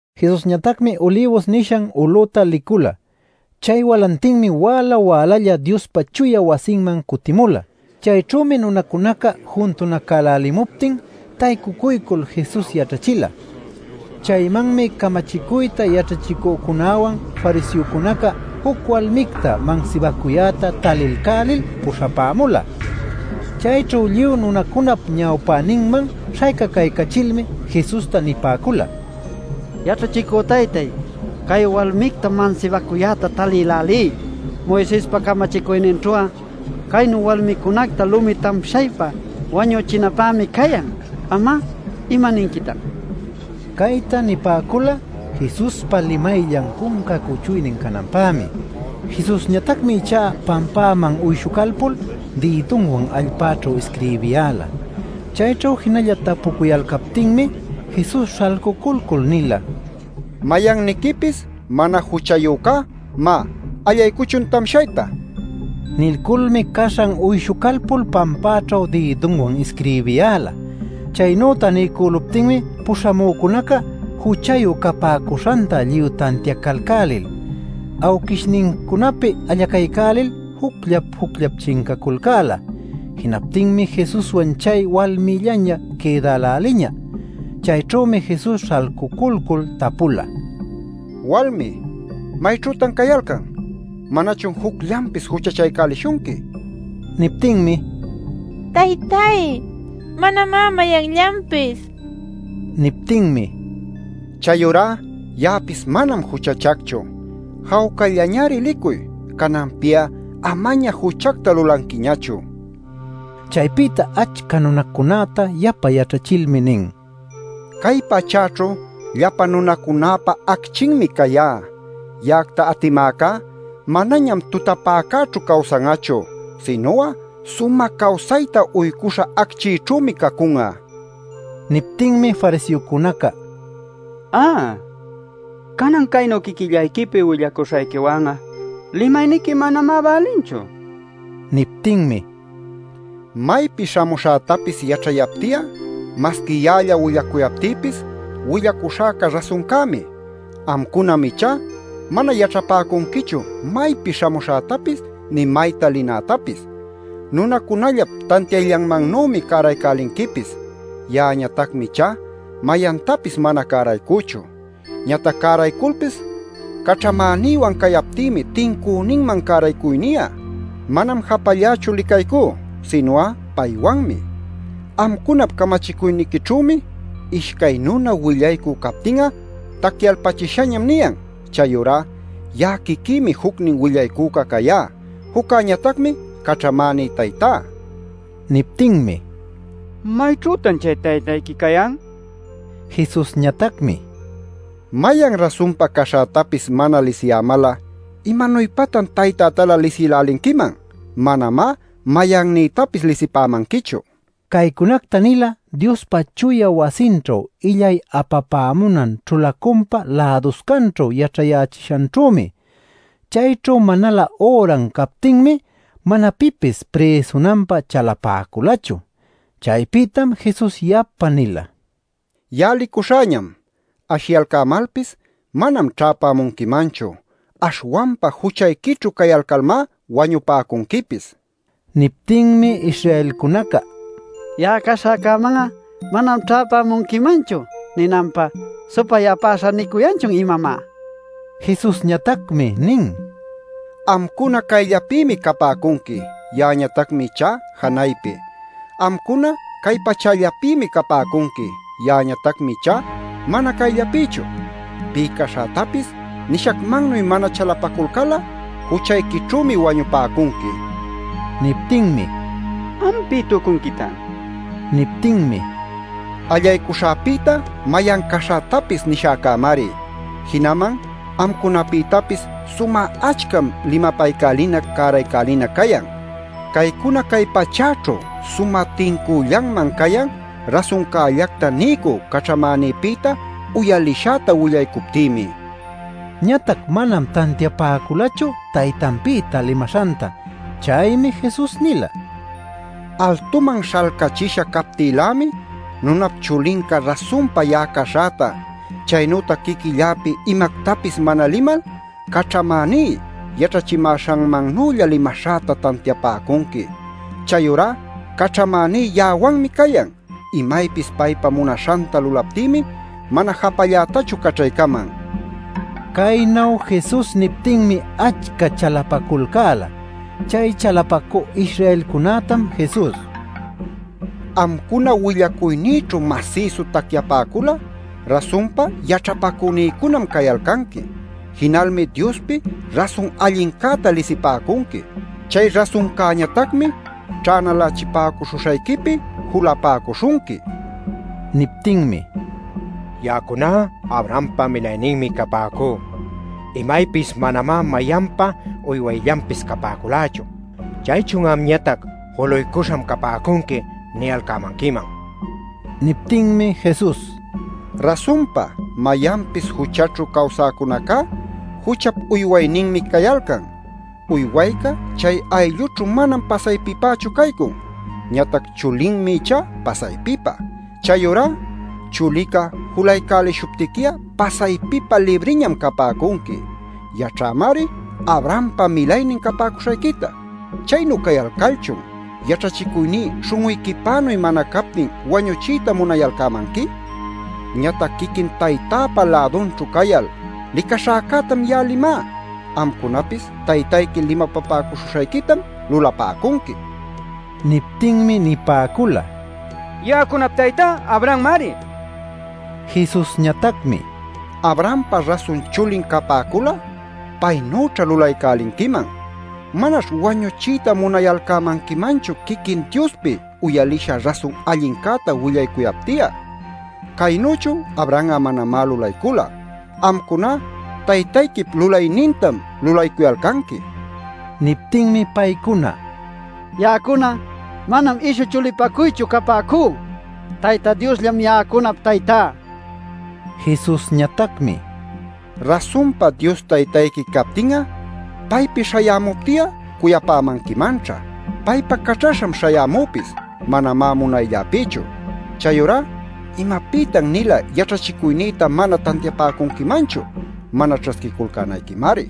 Jesusñatacmi Ulibus nishan ulüta licula. Chay walantinmi wäla wälalla Diospa chuya wasinman cutimula. Chayćhümi nunacunaca juntunacälälimuptin taycucuycul Jesus yaćhachila. Chaymanmi camachicuyta yaćhachicücunäwan fariseocunaca juc walmicta mansibacuyäta talilcälil puśhapämula. Chayćhu lluy nunacunap ñawpäninman śhaycacaycachilmi Jesusta nipäcula: “Yaćhachicü taytay, cay walmictam mansibacuyäta talïlälí. Moisespa camachicuyninćhu'a caynuy walmicunacta lumi tamshaypa wañuchinapämi cayan. ¿Am'a imaninquitan?” nil. Cayta nipäcula Jesuspa limayllan cunca cuchuynin cananpämi. Jesusñatacmi ichá pampäman uyshucalpul dïdunwan allpäćhu isquirbiyäla. Chayćhu jinalla tapucuyalcaptinmi Jesus śhalculcul nila: “Mayanniquipis mana juchayücá, má, allaycuchun tamshayta” nin. Nilculmi caśhan uyshucalpul pampäćhu dïdunwan isquirbiyäla. Chaynüta niycüluptinmi puśhamücunaca juchayu capäcuśhanta lluy tantiacalcälil awquishnincunapi allacaycälil jucllap jucllap chincaculcäla. Jinaptinmi Jesuswan chay walmïllaña quïdäläliña. Chayćhümi Jesus śhalculcul tapula: “Walmi, ¿mayćhütan cayalcan? ¿manachun jucllanpis juchachaycälishunqui?” nil. Niptinmi: “Taytay, manamá mayanllanpis” nin. Niptinmi: “Chayurá ya'apis manam juchachacchu. Jawcallañari licuy. Cananpi'a amañamá juchacta lulanquiñachu” nin. Chaypïta achca nunacunäta yapa yaćhachilmi nin: “Cay pachäćhu llapa nunacunäpa acchinmi cayá. Ya'acta atimäcá manañam tutapäcäćhu cawsan'achu, sinu'a sumä cawsayta uycuśha acchićhümi cacun'a” nil. Niptinmi fariseocunaca: “Ä, canan caynu quiquillayquipi willacuśhayquiwan'a limayniqui manamá bälinchu” nin. Niptinmi: “Maypi śhamuśhätapis yaćhayapti'a masqui ya'alla willacuyaptïpis, willacuśhäca rasuncämi. Amcunam ichá mana yaćhapäcunquichu maypi śhamuśhätapis nï mayta linätapis. Nunacunallap tantiayllanmannümi cäraycälinquipis. Ya'añatacmi ichá mayantapis mana cäraycüchu. Ñatac cärayculpis caćhamänïwan cayaptïmi tincüninman cäraycuyni'a. Manam japallächu licaycú, sinu'a paywanmi. Amcunap camachicuyniquićhümi ‘Ishcay nuna willaycü captin'a tacyalpachishañam’ niyan. Chayurá ya'a quiquïmi jucnin willaycüca cayá; juccäñatacmi caćhamäní Taytá” nin. Niptinmi: “¿Mayćhütan chay taytayqui cayan?” nipäcula. Jesusñatacmi: “Mayan rasunpa caśhätapis mana lisiyämal'a ¿imanuypatan taytätalä lisïlälinquiman? Manamá mayannïtapis lisipämanquichu” nin. Caycunacta nila Diospa chuya wasinćhu illay apapämunan ćhulacunpa läduscanćhu yaćhayächishanćhümi. Chayćhu manalä üran captinmi mana pipis prïsunanpä chalapäculachu. Chaypïtam Jesus yapa nila: “Ya'a licuśhäñam; ashiyalcämalpis manam ćhäpämunquimanchu; aśhwanpa juchayquićhu cayalcalmá wañupäcunquipis” nil. Niptinmi Israelcunaca: “ ‘Ya'a caśhäcäman'a manam ćhäpämunquimanchu’ ninanpä ¿‘supay-apäśhä’ nicuyanchun, imamá?” nipäcun. Jesusñatacmi nin: “Amcuna cayllapïmi capäcunqui; ya'añatacmi ichá janaypi. Amcuna cay pachällapïmi capäcunqui, ya'añatacmi ichá mana cayllapïchu. Pï caśhätapis nishacmannuy mana chalapaculcal'a juchayquićhümi wañupäcunqui” nil. Niptinmi: “Am ¿pï tucunquitan?” nipäcun. Niptinmi: “Allaycuśhäpïta mayan caśhätapis nishäcämari. Jinaman amcunapïtapis sumä achcam limapaycälinac cäraycälinac cayan. Caycuna cay pachächu sumä tincüllanman cayan rasuncällacta niycü caćhamänïpïta uyalishäta willaycuptïmi” nin. Ñatac manam tantiapäculachu, taytanpïta limaśhanta. Chaymi Jesus nila: “Altuman śhalcachisha captïlämi Nunap Chulinca rasunpa ya'a caśhäta, chaynütac quiquilläpi imactapis mana limal, caćhamäní yaćhachimäśhanmannülla limaśhäta tantiapäcunqui. Chayurá caćhamäní ya'awanmi cayan. Imaypis paypa munaśhanta lulaptïmi mana japallätachu caćhaycaman” nin. Caynu Jesus niptinmi achca chalapaculcäla. Chay chalapacü Israelcunätam Jesus: “Amcuna willacuynïćhu masïsu tacyapäcul'a rasunpa yaćhapacünïcunam cayalcanqui. Jinalmi Diospi rasun allincäta lisipäcunqui. Chay rasuncäñatacmi ćhänalächipäcuśhuśhayquipi julapäcuśhunqui” nin. Niptinmi: “Ya'acuná Abrahampa milayninmi capäcú; imaypis manamá mayanpa uywayllanpis capäculächu. ¿Chaychun ‘Amñatac juluycuśham capäcunqui’ niyalcämanquiman?” nipäcula. Niptinmi Jesus: “Rasunpa mayanpis juchaćhu cawsäcunacá juchap uywayninmi cayalcan. Uywayca chay ayllućhu manam pasaypipächu caycun. Ñatac chulinmi ichá pasaypipä. Chayurá Chulica julaycälishuptiqui'a pasaypipä libriñam capäcunqui. Yaćhämari Abrahampa milaynin capäcuśhayquita. ¿Chaynu cayalcalchun yaćhachicuyní śhun'uyquipänuy mana captin wañuchiyta munayalcämanqui? Ñatac quiquin Taytäpa lädunćhu cayal licaśhäcätam ya'a limá; amcunapis taytayqui limapapäcuśhuśhayquitam lulapäcunqui” nin. Niptinmi nipäcula: “Ya'acunap taytá Abrahammari” nil. Jesusñatacmi: “Abrahampa rasun chulin capäcul'a, paynüćha lulaycälinquiman. Manaćh wañuchiyta munayalcämanquimanchu quiquin Diospi uyalisha rasun allincäta willaycuyapti'a. Caynüchu Abraham'a manamá lulaycula. Amcuná taytayquip lulaynintam lulaycuyalcanqui” nin. Niptinmi paycuna: “Ya'acuna manam ishu chulipacuychu capäcú. Tayta Diosllam ya'acunap taytá” nicuyalcan. Jesusñatacmi: “Rasunpa Dios taytayqui captin'a paypi śhayämupti'a cuyapämanquimanćha. Paypa caćhaśham śhayämüpis, manamá munaylläpïchu. Chayurá ¿imapïtan-nila yaćhachicuynïta mana tantiapäcunquimanchu? Mana ćhasquiculcänayquimari.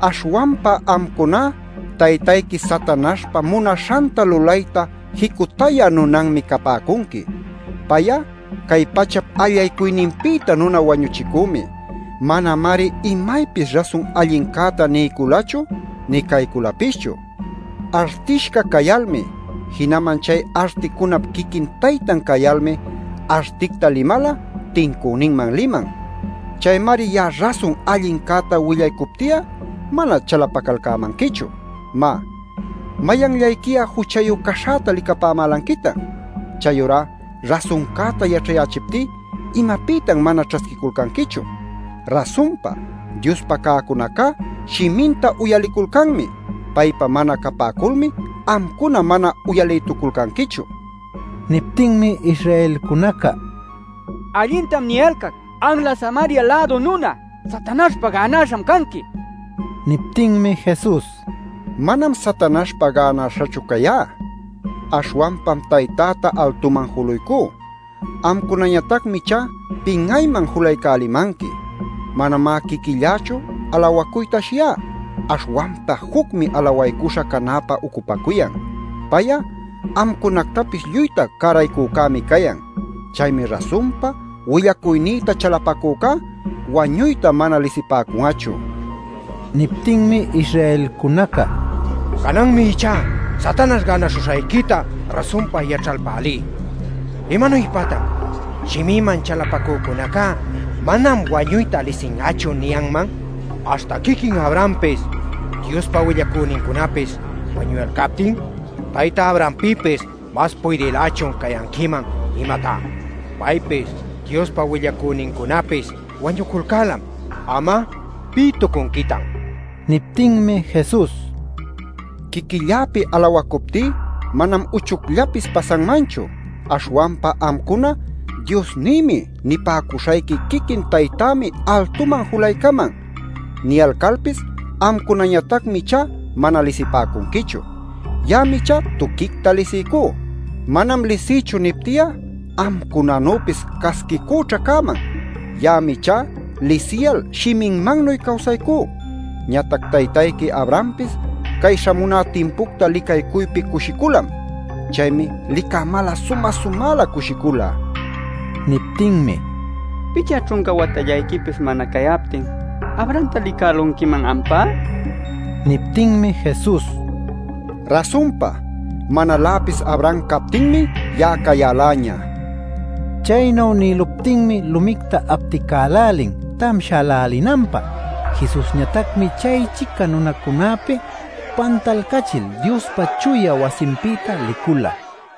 Aśhwanpa amcuná taytayqui Satanaśhpa munaśhanta lulayta jicutayä nunanmi capäcunqui. Pay'a cay pachap allaycuyninpïta nuna wañuchicümi. Manamari imaypis rasun allincäta niyculachu nï cayculapischu. Artishca cayalmi jinaman chay articunap quiquin taytan cayalmi articta limal'a tincüninman liman. Chaymari ya'a rasun allincäta willaycupti'a mana chalapacalcämanquichu. Má ¿mayanllayqui'a juchayu caśhäta licapämälanquitan? Chayurá rasuncäta yaćhayächiptí ¿imapïtan mana ćhasquiculcanquichu? Rasunpa, Diospa cäcunacá shiminta uyaliculcanmi. Paypa mana capäculmi amcuna mana uyalïtuculcanquichu” nin. Niptinmi Israelcunaca: “Allintam niyalcac ¡anla Samaria-lädu nuna Satanaśhpa gänaśham canqui!” nipäcun. Niptinmi Jesus: “Manam Satanaśhpa gänaśhachu cayá. Aśhwanpam Taytäta altuman juluycú; amcunañatacmi ichá pin'ayman julaycälimanqui. Manamá quiquillächu alawacuyta ashiyá; aśhwanpa jucmi alawaycuśha canäpä ucupacuyan. Pay'a amcunactapis lluyta cäraycücämi cayan. Chaymi rasunpa willacuynïta chalapacücá wañuyta mana lisipäcun'achu” nin. Niptinmi Israelcunaca: “Cananmi ichá Satanaśh gänaśhuśhayquita rasunpa yaćhalpälí. ¡¿Imanuypatan ‘Shimïman chalapacücunacá manam wañuyta lisin'achu’ niyanman, aśhta quiquin Abrahampis Diospa willacünincunapis wañuyalcaptin?! ¿Tayta Abrahampïpis mas puydïlächun cayanquiman, imatá? Paypis Diospa willacünincunapis wañuculcälam. ¿Am'a pï tucunquitan?” nipäcun. Niptinmi Jesus: “Quiquilläpi alawacuptí manam uchucllapis pasanmanchu. Aśhwanpa amcuna ‘Diosnïmi’ nipäcuśhayqui quiquin Taytämi altuman julaycaman. Niyalcalpis amcunañatacmi ichá mana lisipäcunquichu. Ya'ami ichá tuquicta lisiycú. ‘Manam lisïchu’ nipti'a amcunanüpis casquicüćha cäman. Ya'ami ichá lisiyal shiminmannuy cawsaycú. Ñatac taytayqui Abrahampis cay śhamuná timpucta licaycuypi cushiculam. Chaymi licämal'a sumä-sumälä cushicula” nin. Niptinmi: “Picha ćhunca watallayquipis mana cayaptin ¡Abrahamta licälunquiman ampá!” nipäcun. Niptinmi Jesus: “Rasunpa, manaläpis Abraham captinmi ya'a cayäläña” nin. Chaynu nïluptinmi lumicta apticälälin tamshälälinanpä. Jesusñatacmi chay-chica nunacunäpi pantalcachil Diospa chuya wasinpïta licula.